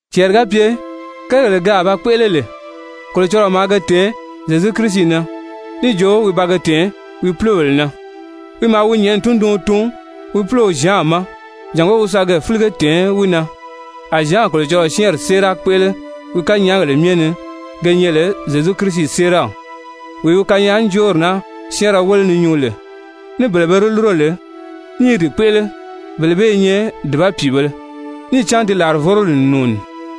Cɛɛri ga pye kérigèle ke a ba kpéʔele lè, Kolocɔlɔɔ maa ge tɛ̀ɛn Zyezu Kirisi na, níì jo wi ba ge tɛ̀ɛn wi púlobèle na, wi maa wi nyɛ̀ʔɛni tunduɔn tun wi púlow Zyan ma jàngó wi sa ge fílige tɛ̀ɛn wi na, a Zyan Kolocɔlɔɔ syɛ́ɛnri séera kpéʔele wi kanyaagèle myɛ ni ge nyɛ lè Zyezu Kirisi séeraw. Wee wi kanyaajoori naa syɛ́ɛnrɛ wéle ni nyuu lè, ní bele be di lúro lè ní i di kpéʔele, bele bee i nyɛ dùba pìibēle! Níì cán ti làrivoroli n nùuni.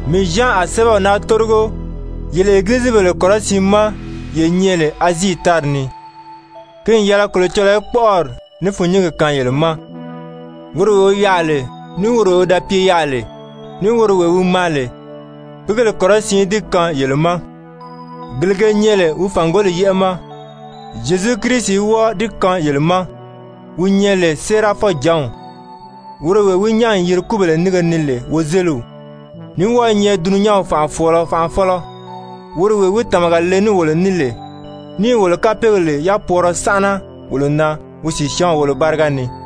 Mii Zyan a sɛ́bɛw naa tórigo yele Egilizibèle kɔrɔsiin ma ye nyɛ lè Azii tári ni, ki n yɛlɛ Kolocɔlɔɔ í kpɔ́ʔɔri ní fûnnyingi kaan yele ma, woro wee wi yaà lè, ní woro wee wi da pye yaà lè, ní woro wee wi maa lè, pìígèle kɔrɔsiin í di kaan yele ma, gele ge nyɛ lè wi fàngoli yɛ́ʔɛ ma. Zyezu Kirisi í wɔ́ɔ di kaan yele ma, wi nyɛ lè séerafɔjǎnw, woro wee wi nyán n yiri kúbèle nínge ni lè wozeliw, ní wɔ́ɔ i nyɛ dulunyanw fànʔafɔɔlɔ Fanʔafɔlɔ! Woro wee wi tàmaga le ní wolo ní lè níì wolo kapeegèle yapwɔɔrɔ sánʔana wolo na wi sìsyaanw wolo báriga ni,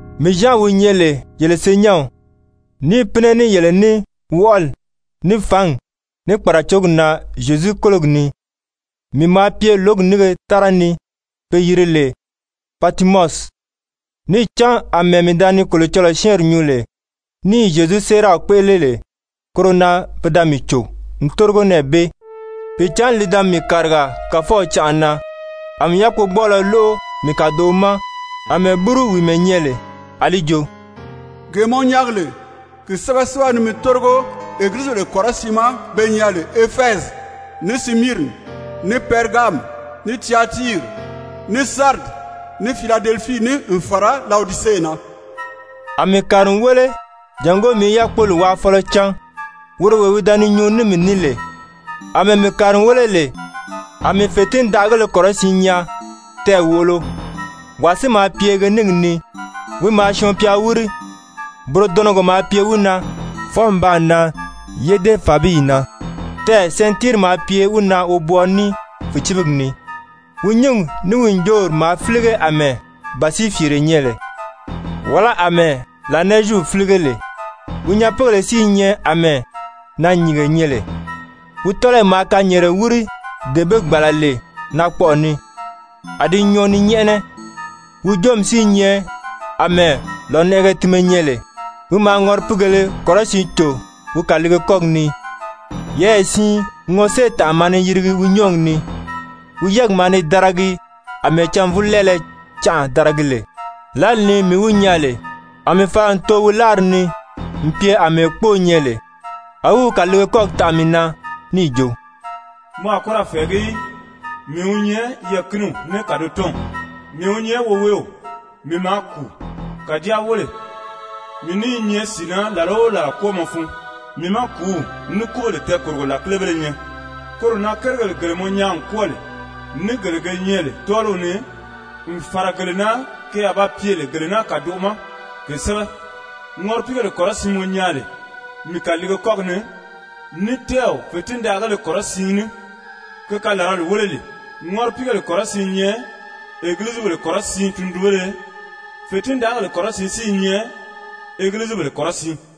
Mii Zyan, wi nyɛ lè yele senyɛnw, níì pínɛ ní yele ní wɔʔɔli, ní fǎngi, ní kpàracogi na Zyezu kólogi ni, mii maa pye lǒgi nínge tára ni pe yiri lè Patimɔsi. Níì cán àmɛɛ mii da ni Kolocɔlɔɔ syɛ́ɛnri nyuu lè, ní i Zyezu séeraw kpéʔele lè, koro na pe da mii cò n tórigo nɛɛ bee. Pìicǎnni li da mii kàriga Kàfɔw canʔa na, a mii yákpogbɔɔlɔ lóʔo mii kàdoʔo ma àmɛɛ búru wìimɛ nyɛ lè, a li jo: «Gee mɔ nyaagi lè, ki sɛ́bɛ sɛ́bɛ ni mi tórigo Egilizibèle kɔrɔsiin ma be nyɛ lè Efɛzi, ní Simiirini, ní Pɛrigami, ní Tyatiiri, ní Saridi, ní Filadelifii ni n fàra Lawodise na.» A mii kàri n wéle jàngó mii í yákpoli wáafɔlɔ cán, woro wee wi da ni nyuu ní mii ní lè. Amɛɛ mii kàri n wéle lè, a mii fètindaʔagéle kɔrɔsiin nyaa, tɛɛ̀ wòʔolo, wàa si maa pye ge níngi ni, wi maa syɔɔn-pya wíri. Burodɔnɔgɔ maa pye wi na, fwɔɔ n baa nan yédefabiyi na, tɛɛ̀ sɛntiiri maa pye wi na wobwɔɔɔ ní fìcibigi ni. Wi nyúngi ní wi ǹjoori maa fílige àmɛɛ bàsiifiire nyɛ lè, wàlá àmɛɛ lànɛɛzyiw fílige lè. Wi nyapiigèle si i nyɛ àmɛɛ naanyìnge nyɛ lè. Wi tɔ́lɔyi maa kanyɛɛnrɛ wíri dee be gbàla lè naakpɔʔɔ ni, a di nyɔɔ ni nyɛ́ʔɛnɛ, wi joomi si i nyɛ àmɛɛ lònɛʔɛgɛ tinmɛ nyɛ lè. Wi maa ŋɔripiigèlē kɔrɔsiin cò wi kàliige kɔ́gi ni, yɛɛyɛ siin ŋɔséetànʔa maa ni yirigi wi nyɔ́ɔgi ni, wi yɛ́ɛgi maa ni daragi àmɛɛ cânvulɛɛlɛ canʔa daragi lè. Lǎli ni mii wi nyaa lè, a mii fala n too wi láari ni n pye àmɛɛ kpóo nyɛ lè. A wi wi kàliige kɔ́gi taʔa mii na níì jo: «Mɔ a kɔ́ ra fɛ̀ɛgí í! Mii wi nyɛ Yɛɛ̀kiniw ní Kàdotɔnw, mii wi nyɛ Woweew. Mii maa kùu, kàjáa wéle, mii ní i nyɛ sìi na làla o làla kwɔ́ɔmɔ fun. Mii má kùúw ní kúbèle tɛɛkòrogo làkilebéle nyɛ. Koro na kérigèle gele mɔ nyaa n kwɔ́ɔ lè, ní gele ge nyɛ lè tɔ́ɔliw ni, n fàra gele na ke a ba pye lè gele naa kàdoʔo ma, ke sɛ́bɛ. Ŋɔripiigèle kɔrɔsiin mɔ nyaa lè mii kàliige kɔ́gi ni, ní tɛ́ɛw fètindaʔagéle kɔrɔsiin ní, ke kalarali wéle lee, ŋɔripiigèle kɔrɔsiin i nyɛ Egilizibèle kɔrɔsiin tundunbéle, fètindaʔagèle kɔrɔsiin si i nyɛ Egilizibèle kɔrɔsiin.